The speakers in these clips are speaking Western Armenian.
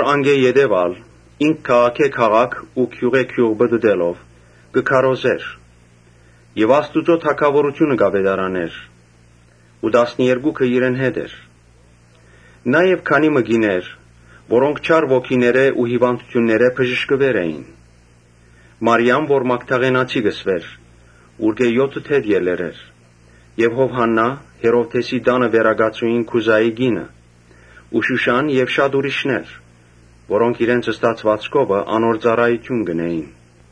Անկէ յետոյ՝ ինք քաղաքէ քաղաք ու գիւղէ գիւղ պտըտելով՝ կը քարոզէր եւ Աստուծոյ թագաւորութիւնը կ’աւետարանէր ու տասներկուքը իրեն հետ էին, Նաեւ քանի մը կիներ՝ որոնք չար ոգիներէ ու հիւանդութիւններէ բժշկուեր էին. Մարիամը, որ Մագդաղենացի կը կոչուէր, ուրկէ եօթը դեւ ելեր էր Եւ Յովհաննան՝ Հերովդէսին տանը վերակացուին՝ Քուզայի կինը ու Շուշան եւ շատ ուրիշներ, որոնք իրենց ստացուածքովը Ոմանք, անոնցանոր ծառայութիւն կ’ընէին։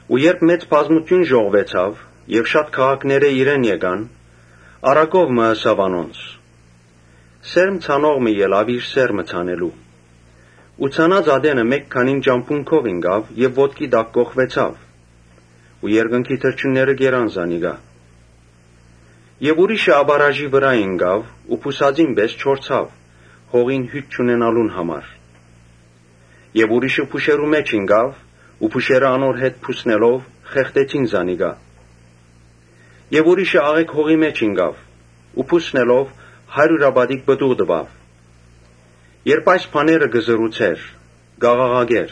Երբ մեծ բազմութիւն ժողվուեցաւ եւ շատ քաղաքներէ իրեն եկան, առակ մը ըսաւ անոնց. «Սերմ ցանող մը ելաւ իր սերմը ցանելու։ Ցանած ատենը մէկ քանին ճամբուն քով ինկան եւ ոտքի տակ կոխկռտուեցան ու երկնքի թռչունները կերան զանոնք։ Ուրիշներ ապառաժի վրայ ինկան ու բուսածին պէս չորցան, հողին հիւթ չունենալուն համար։ Եւ ուրիշներ փուշերու մէջ ինկան ու փուշերը անոնց հետ բուսնելով խեղդեցին զանոնք։ Եւ ուրիշներ աղէկ հողի մէջ ինկան ու բուսնելով՝ հարիւրապատիկ պտուղ տուին»։ Երբ այս բաները կ’ըսէր, կ’աղաղակէր.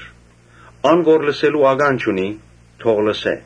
«Ան որ լսելու ականջ ունի՝ թող լսէ»։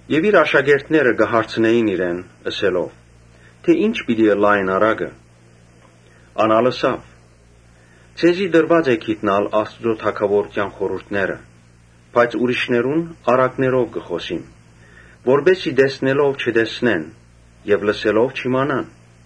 Իր աշակերտները հարցուցին իրեն՝ ըսելով. «Ի՞նչ պիտի ըլլայ այս առակը»։ Ան ալ ըսաւ. «Ձեզի տրուած է հասկնալ Աստուծոյ թագաւորութեան խորհուրդները, բայց ուրիշներուն առակներով կը խօսիմ. որպէս զի տեսնելով՝ չտեսնեն եւ լսելով՝ չիմանան»։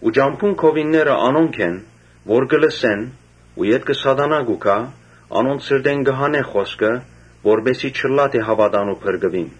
Ճամբուն քովինները անոնք են՝ որ կը լսեն ու ետքը Սատանան կու գայ, անոնց սրտէն կը հանէ խօսքը, որպէս զի չըլլայ թէ հաւատան ու փրկուին։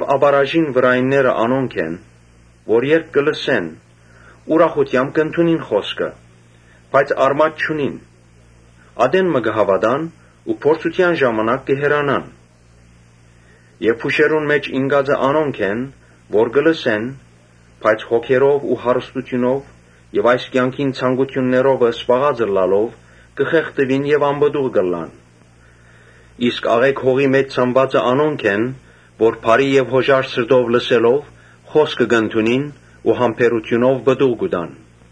Ապառաժին վրայինները անոնք են՝ որ երբ լսեն, ուրախութեամբ կ’ընդունին խօսքը, բայց արմատ չունին։ Ատեն մը կը հաւատան ու փորձութեան ժամանակ կը հեռանան։ Փուշերուն մէջ ինկածները անոնք են՝ որ կը լսեն, բայց հոգերով ու հարստութիւնով եւ այս կեանքին ցանկութիւններով զբաղած ըլլալով՝ կը խեղդուին եւ անպտուղ կ’ըլլան։ Իսկ աղէկ հողի մէջ ցանուածը անոնք են՝ որ բարի եւ յօժար սրտով լսելով խօսքը՝ կ’ընդունին ու համբերութիւնով պտուղ կու տան»։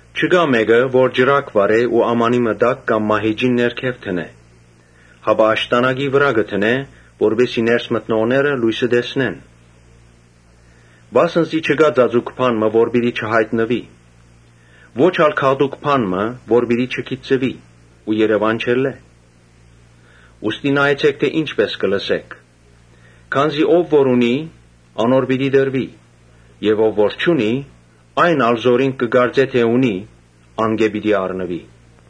«Չկայ մէկը, որ ճրագը վառէ ու ամանի մը տակ կամ մահիճին ներքեւ դնէ, հապա աշտանակի վրայ կը դնէ, որպէս զի ներս մտնողները լոյսը տեսնեն։ Վասն զի չկայ ծածուկ բան մը, որ պիտի չյայտնուի, ո՛չ ալ գաղտուկ բան մը, որ պիտի չգիտցուի ու երեւան չելլէ։ Ուստի նայեցէք թէ ի՛նչպէս կը լսէք. քանզի ով որ ունի՝ անոր պիտի տրուի եւ ով որ չունի՝ այն ալ որ ինք կը կարծէ թէ ունի, ան ալ անկէ պիտի առնուի»։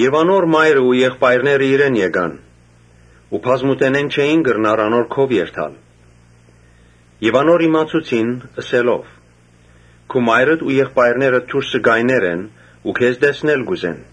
Անոր մայրն ու եղբայրները իրեն եկան, բայց բազմութենէն չէին կրնար անոր քով երթալ։ Անոր իմացուցին՝ ըսելով. ‘Քու մայրդ ու եղբայրներդ դուրսը կայներ են ու քեզ տեսնել կ’ուզեն’։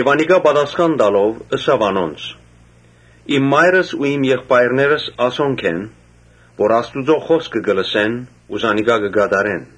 Անիկա պատասխան տալով՝ ըսաւ անոնց. «Իմ մայրս ու եղբայրներս անոնք են, որ Աստուծոյ խօսքը կը լսեն ու զանիկա կը կատարեն»։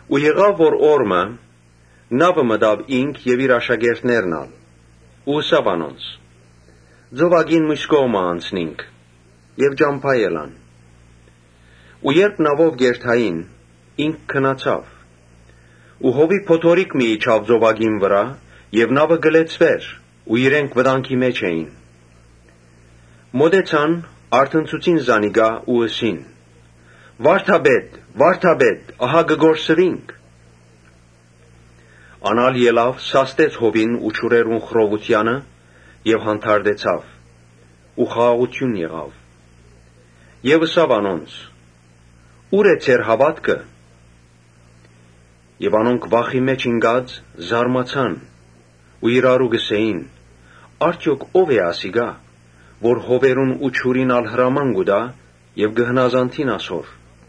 Օր մը նաւը մտան Յիսուս եւ իր աշակերտներն ալ ու ըսաւ անոնց. «Ծովակին միւս կողմը անցնինք»։ Ճամբայ ելան։ Երբ նաւով կ’երթային ինք քնացաւ։ Զօրաւոր փոթորիկ մը ելաւ ծովակին վրայ։ Նաւը ջուրով կը լեցուէր ու իրենք վտանգի մէջ էին։ Մօտեցան, արթնցուցին զանիկա ու ըսին. «Վա՛րդապետ, վա՛րդապետ, ահա կը կորսուինք»։ Ան ալ ելաւ սաստեց հովին ու ջուրերուն խռովութեանը եւ հանդարտեցաւ ու խաղաղութիւն եղաւ։ Այն ատեն ըսաւ անոնց. «Ո՞ւր է ձեր հաւատքը»։ Անոնք վախի մէջ ինկած՝ զարմացան ու իրարու կ’ըսէին. «Արդեօք ո՞վ է ասիկա՝ որ հովերուն ու ջուրին ալ հրաման կու տայ եւ կը հնազանդին իրեն»։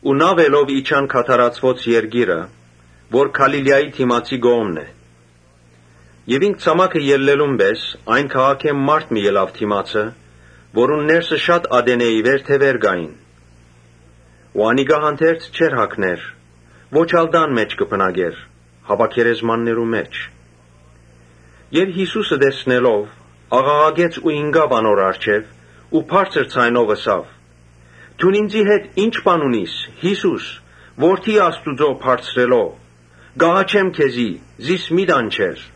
Ու նաւելով իջան Գադարացիներուն երկիրը, որ Գալիլիայի դիմացի կողմն է։ Ինք ցամաքը ելլելուն պէս՝ այն քաղաքէն մարդ մը ելաւ դէմը, որուն ներսը շատ ատենէ ի վեր դեւեր կային ու անիկա հանդերձ չէր հագներ, ոչ ալ տան մէջ կը բնակէր, հապա գերեզմաններու մէջ։ Ան՝ Յիսուսը տեսնելով՝ աղաղակեց ու ինկաւ անոր առջեւ ու բարձր ձայնով ըսաւ. «Դուն ինծի հետ ի՞նչ բան ունիս, Յիսո՛ւս, Որդի Բարձրեալն Աստուծոյ. կ’աղաչեմ քեզի, զիս մի տանջեր»։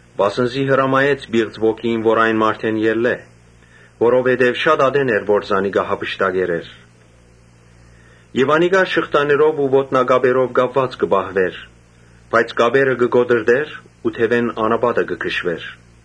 (Վասն զի հրամայեց պիղծ ոգիին որ այն մարդէն ելլէ. որովհետեւ շատ ատեն էր որ զանիկա գրաւած էր եւ անիկա շղթաներով ու ոտնակապերով կապուած կը պահուէր, բայց կապերը կը կոտրտէր ու դեւէն անապատը կը քշուէր։)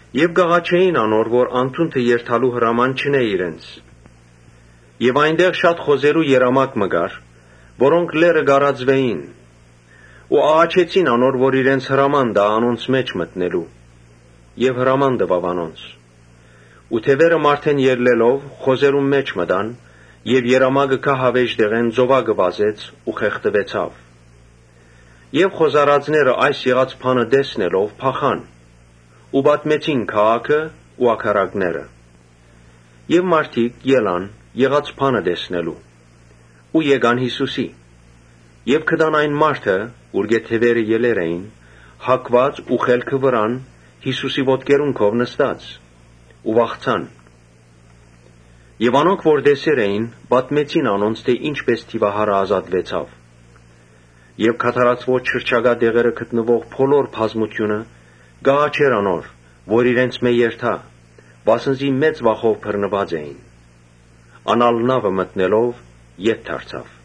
Անոնք կ’աղաչէին անոր որ անդունդը երթալու հրաման չընէ իրենց։ Հոն խոզերու երամակ մը կար, որոնք լեռը կ’արածուէին։ Աղաչեցին որ իրենց հրաման տայ անոնց մէջ մտնելու։ Յիսուս հրաման տուաւ անոնց։ Դեւերը մարդէն ելլելով՝ խոզերուն մէջ մտան։ Երամակը գահավէժ տեղէն ծովակը վազեց ու խեղդուեցաւ։ Խոզարածները ասիկա տեսնելով փախան ու պատմեցին քաղաքը ու ագարակները։ Մարդիկ ելան եղած բանը տեսնելու։ Եկան Յիսուսին, գտան այն մարդը՝ ուրկէ դեւերը ելեր էին, հագուած ու խելքը վրան Յիսուսին ոտքերուն քով նստած ու վախցան։ Անոնք որ տեսեր էին, պատմեցին անոնց թէ ի՛նչպէս դիւահարը ազատեցաւ։ Գադարացիներու շրջակայքը գտնուող բոլոր բազմութիւնը կ’աղաչէր անոր, որ իրենցմէ երթայ, վասն զի մեծ վախով բռնուած էին։ Ան ալ նաւը մտնելով ետ դարձաւ։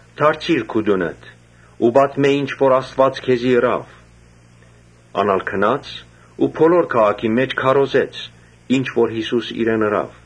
«Դարձիր քու տունդ ու պատմէ ինչ որ Աստուած քեզի ըրաւ»։ Ան ալ գնաց ու բոլոր քաղաքին մէջ պատմեց ինչ որ Յիսուս իրեն ըրաւ։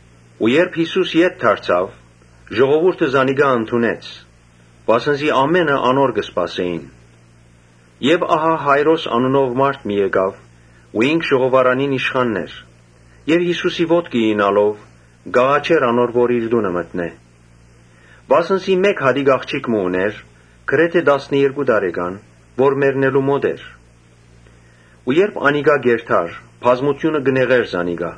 Երբ Յիսուս ետ դարձաւ, ժողովուրդը զանիկա ընդունեց, վասն զի ամէնքը իրեն կը սպասէին։ Ահա Յայրոս անունով մարդ մը եկաւ, որ ժողովարանին իշխանն էր, Յիսուսին ոտքը իյնալով կ’աղաչէր անոր որ իր տունը մտնէ, Վասն զի մէկ հատիկ աղջիկ մը ունէր, գրեթէ տասներկու տարեկան, որ մեռնելու մօտ էր։ Երբ Յիսուս կ’երթար, բազմութիւնը կը նեղէր զինք։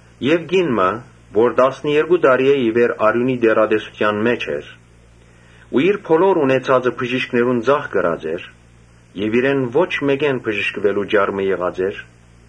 Կին մը, որ տասներկու տարիէ ի վեր արիւնի տեռատեսութեան մէջ էր ու իր բոլոր ունեցածը բժիշկներուն ծախսած էր բայց ոչ մէկէն բժշկուելու ճար մը գտած էր,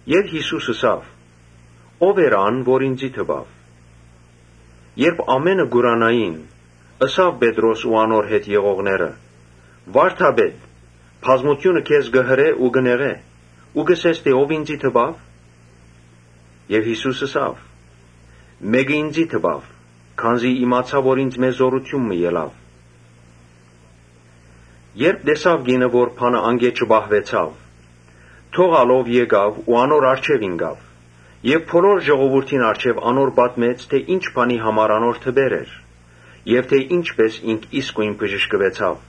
Եւ Յիսուս ըսաւ. «Ո՞վ էր ան որ ինծի դպաւ»։ Երբ ամէնքը կ’ուրանային, ըսին Պետրոս ու իրեն հետ եղողները. «Վարդապետ, բազմութիւնը քեզ կը հրէ ու կը նեղէ ու կ’ըսես թէ ‘Ո՞վ ինծի դպաւ’»։ Յիսուս ըսաւ. «Մէկը ինծի դպաւ, քանզի իմացայ որ ինծմէ զօրութիւն մը ելաւ»։ Կինը երբ տեսաւ թէ բանը անկէ չծածկուեցաւ, դողալով եկաւ ու անոր առջեւ ինկաւ եւ բոլոր ժողովուրդին առջեւ անոր պատմեց թէ ի՛նչ բանի համար անոր դպեր էր եւ թէ ի՛նչպէս ինք իսկոյն բժշկուեցաւ։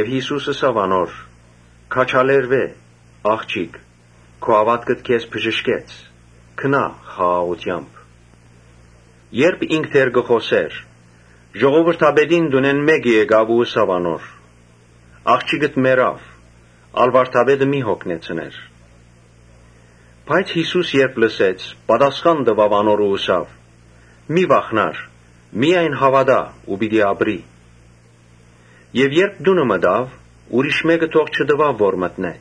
Յիսուս ըսաւ անոր. «Քաջալերուէ՛, ա՛ղջիկ, քու հաւատքդ քեզ բժշկեց։ Գնա խաղաղութեամբ»։ Երբ ինք դեռ կը խօսէր, ժողովրդապետին տունէն մէկը եկաւ ու ըսաւ. «Աղջիկդ մեռաւ, ա՛լ վարդապետը մի յոգնեցներ»։ Բայց Յիսուս երբ լսեց ատիկա, ըսաւ անոր. «Մի՛ վախնար, միայն հաւատա ու պիտի ապրի»։ Երբ տունը մտաւ, ուրիշ մէ՛կը թող չտուաւ որ մտնէ,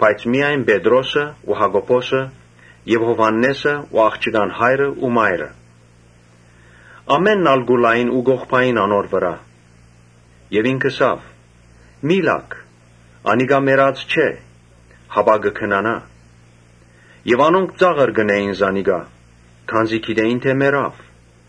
բայց միայն Պետրոսը ու Յակոբոսը եւ Յովհաննէսը ու աղջկան հայրն ու մայրը։ Ամէնքն ալ կու լային ու կ’ողբային անոր վրայ. եւ ինք ըսաւ. «Մի՛ լաք, անիկա մեռած չէ, հապա կը քնանայ»։ Անոնք ծաղր կ’ընէին զանիկա, քանզի գիտէին թէ մեռաւ։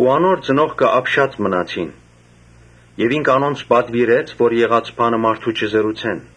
Անոր ծնողքը ապշած մնացին։ Յիսուս անոնց պատուիրեց, որ եղածը մարդո՛ւ չըսեն։